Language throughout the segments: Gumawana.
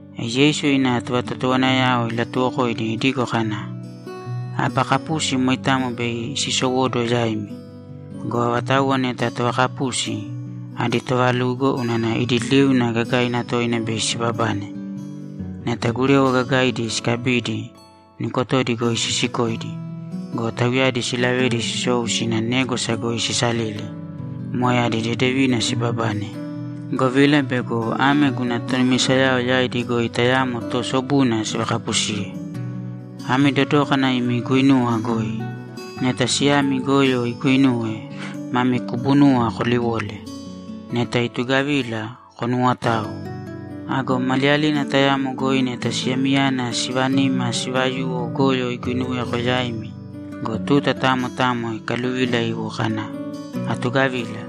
E Yeisu ina tovatotowanayao ilatuwokoidi idigo kana, ‘Aba kapusi moitamo bei sisowóduwo yaimi go, avatauwa neta tovakapusi, adi toovalugo unana idi liuna gagaina toina bei sibabane! Neta gurewa gagaidi sikabidi, nukotodi goi sisikoidi go, tauyadi silavedi sisou sina négwasa goi sisalili, moe adi dedevina sibabane, govila bego ame guna tonumisayao yaidi goi tayamo toosobuna sivakapusiye. Ami dodōkana imi guinuwa goi! Neta siyami goyo iguinuwe, mami kubunuwa koliwole. Neta itugavila, konuwotāo. Ago maliyalina tayamo goi neta siyamiyana sivanima sivayuwo goyo iguinuweko yaimi go, tuta tamo tamo ikaluvila iwo kana, “Atugavila”,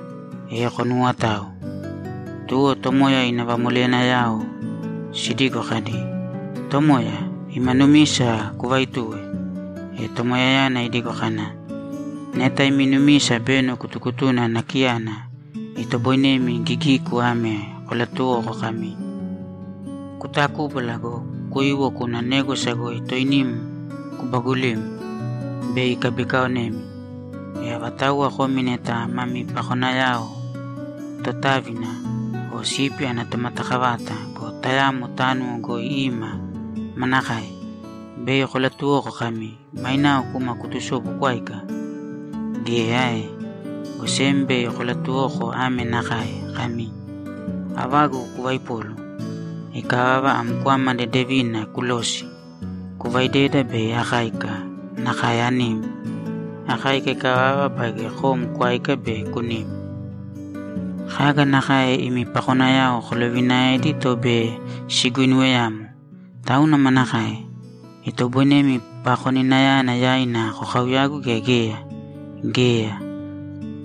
e konuwotāo.’ Tuwo Tomoya ina vamoleyanayao sidigo kadi, ‘Tomoya, ima numisa kuvaitūwe.’ E Tomoyayana idigo kana, ‘Neta imi numisa beno kutukutuna nakiyana, itoboinemi gigiku ame kolatuwoko kami, “Kutakubāla go, kuīwo kūna négwasa goi toinim kubagulīm.” Bei ikabikaonemi. E avatauwa komi neta mami pakonayao totávina o sipi ana tomatakavata go, tayamo tánuwo goi ima, manakae? Bei kolatuwoko kami, “Mainao kūma kutusōbu kwāika”? Geya ae? Go sem bei kolatuwoko ame nakae kami, “Avagu kuvaipōlu. Ikavava, am kwama dedevina kulōsi, kuvaidēda bei akáika nakae anim. Akáika ikavava baige kom kwāika be kunīm.” Kaga nakae imi pakonayao kolovinaedi to bei siguinuweyamo. Tauna manakae? Itoboinemi pakoninayana yaina kokauyagu gea geya? Geya.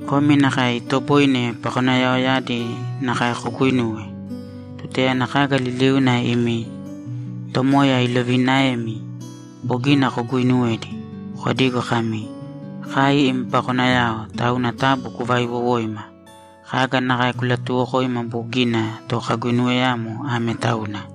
Komi nakae itoboine pakonayaoyadi nakae koguinuwe. Tutayana kaga liliuna imi tomoya iloviinaemi bogina koguinuwedi, kodīgo kami, “Kai im pakonayao, tauna taabu kuvaaiwowōima. Kaga nakae kulatuuwokoima bogina to kaguinuweyamo ame tauna.”’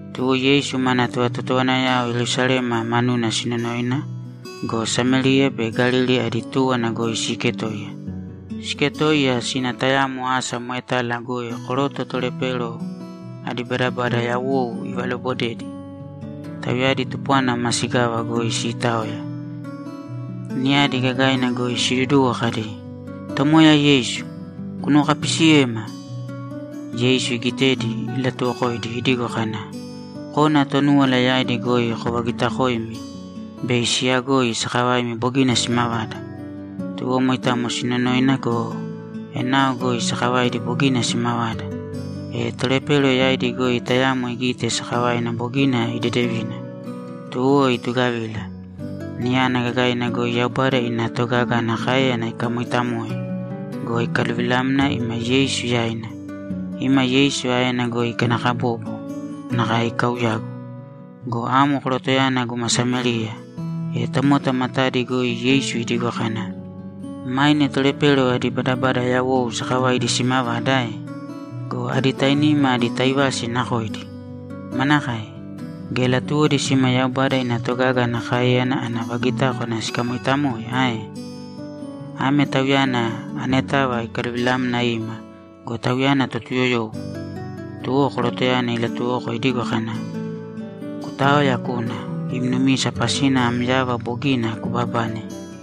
Tuwo Yeisu mana tovatotowanayao Yerusalema manuna sinonoina go, Samériya be Galili adi túwana goi siiketoiya. Siiketoiya sina tayamo asa moetala goi koroto tolepero adi badabada yawou ivalobodedi; tauyadi tupwana masigava goi siitaoya niyadi gagaina goi siduduwo kadi, ‘Tomoya Yeisu, kunuwokapisiyēma!’ Yeisu igitedi, ilatuwokoidi idigo kana, ‘Kōna Tonúwala yaidi goi kovagitakoēmi bei siyagoi sakavaimi bogina simavada.’ Tuwo moitamo sinonoina go, enao goi sakavaidi bogina simavada. E tolepero yaidi goi tayamo igite sakavaina bogina idedevina, tuwo itugavila, niyana gagaina goi Yaubada ina togaga ana káeyana ikamooitamoe go, ikaluvilamna ima Yeisu yaina. Ima Yeisu aena goi ikanakabobo nakae ikauyagu. Go amo korotoyana guma Samériya! E tomota matadi goi Yeisu idigo kana, ‘Maine tolepero adi badabada yawou sakavaidi simavada ae? Go adi tainima adi taivasi nakoidi? Manakae? Geya latuwodi sima Yaubada ina togaga ana káeyana ana vagitákwana sikamoitamoe ae? Ame tauyana anetava ikaluvilamna ima go, tauyana Totuyoyowo!’ Tuwo korotoyana ilatuwoko idigo kana, ‘Kutāoya kūna. Im numisa pasina am yava bogina kubabane.’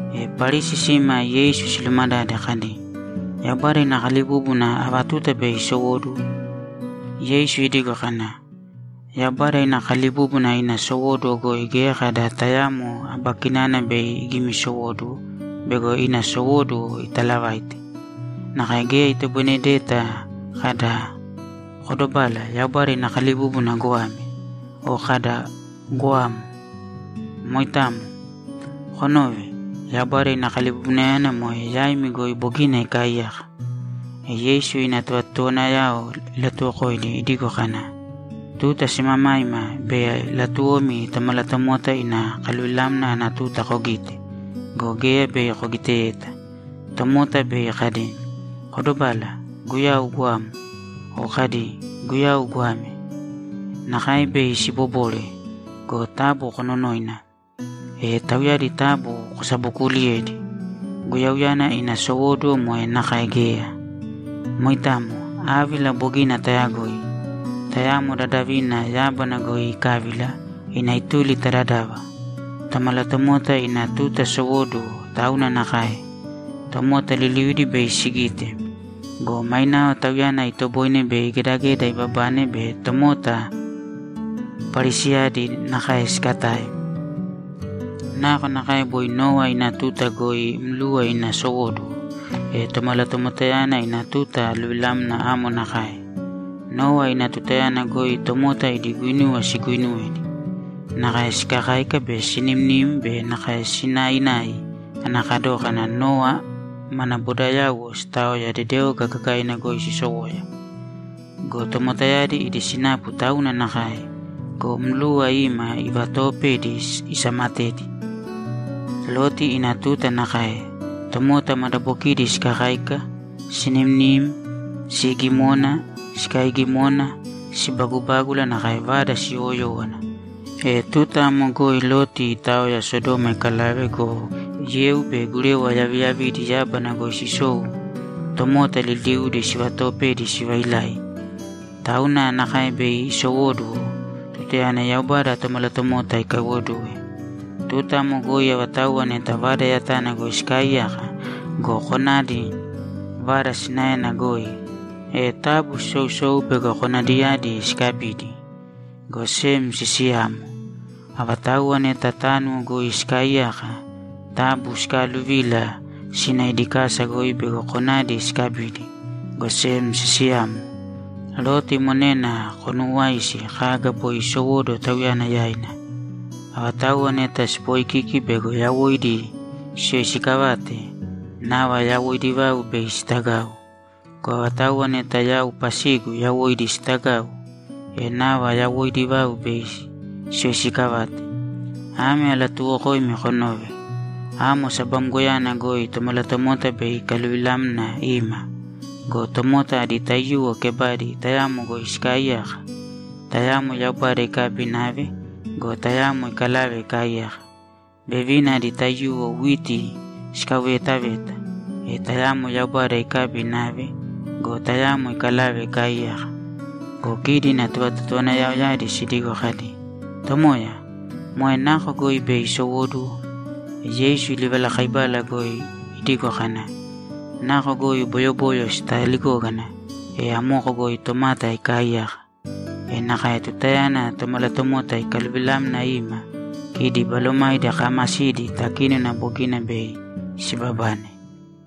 E Parisi sima Yeisu silumadade kadi, ‘Yaubada ina kalibúbuna ava tuta be isowóduwo?’ Yeisu idigo kana, ‘Yaubada ina kalibúbuna ina sowóduwo goi geya kada tayamo aba kinana bei igimisowóduwo bego ina sowóduwo italavaite. Nakae geya itoboinedeta kada, “Kodobāla, Yaubada ina kalibúbuna goame!” O kada, “Goamo!” Moitamo. Konōve! Yaubada ina kalibubunayana moe yaimi goi bogina ikaaiyaka.’ E Yeisu ina tovatotowanayao ilatuwokoidi idigo kana, ‘Tuta simamaima bei latuwomi Tomalatomota ina kaluvilamna ana tuta kogite go, geya bei kogiteyeta. Tomota bei kadi, “Kodobāla Guyau goamo!” O kadi, “Guyau goame!” Nakae bei sibobore go, taabu kononōina, e tauyadi taabu kosabokuuliyēdi. Guyauyana ina sowóduwo moe nakae geya. Moitamo. Ávila bogina tayagoi. Tayamo dadavina yábana goi ikávila ina ituli ta dadava. Tomalatomota ina tuta sowóduwo tauna nakae. Tomota liliudi bei sigite. Go mainao Tauyana itoboine bei gedageda ibabane be tomota Parisiyadi nakae sikatae. Nakonakae boi Nowa ina tuta goi mluwa ina sowóduwo, e Tomalatomotayana ina tuta aluvilamna amo nakae. Nowa ina tutayana goi tomota idi guinuwa siguuinuwedi. Nakae sikakáika be sinimnim be nakae sinainai ana kadókana Nowa mana bodayauwo sitaoya dedeoga gagaina goi sisowoya. Go tomotayadi idi sinapu tauna nakae go, mluwa ima ivatoopedi isamatedi. Loti ina tuta nakae. Tomota madabokidi sikakáika, sinimnim, siigimona, sikaaigimona, sibagubágula, nakae vada siyowoyówana. E tuta amo goi Loti itaoya Sodoma ikalave go, yeu be gurewa yaviyavidi yábana goi sisou tomota liliudi sivatoopedi sivailai. Tauna nakae bei isowóduwo tutayana Yaubada Tomalatomota ikaiwoduwe. Tuta amo goi avatauwa neta vada yatana goi sikaaiyaka go, konadi vada sinaena goi, e taabu sisousōu bego konadiyadi sikabidi, go sem sisiyāmo. Avatauwa neta tánuwo goi sikaaiyaka, taabu sikaaluvīla sīna idi kasa goi bego konadi sikabidi, go sem sisiyāmo. Loti monena konuuwāisi kaga boi isowóduwo tauyana yaina. Avatauwa neta sipoikiki bego yawoidi siyoisikavate, nava yawoidi vau bei sitagau. Go avatauwa neta yau pasigu yawoidi sitagau, e nava yawoidi vau bei siyoisikavate. Ame alatuuwokoimi konōve: Amo sabamgoyana goi Tomalatomota bei ikaluvilamna ima go, tomota adi taiyuwo kebadi tayamo goi sikaaiyaka. Tayamo Yaubada ikabi inave go, tayamo ikalave ikaaiyaka. Vevina adi taiyuwo witi sikauveetaveta. E tayamo Yaubada ikabi inave go, tayamo ikalave ikaaiyaka.’ Go kidi ina tovatotowanayaoyadi sidigo kadi, ‘Tomoya, moe nako goi bei isowóduwo?’ E Yeisu livalakaibala goi idigo kana, ‘Nako goi boyoboyo sitaligógana, e amoko goi tomata ikaaiyaka. E nakae tutayana Tomalatomota ikaluvilamna ima, kidi balomaidi kaamasidi takínona bogina bei sibabane.’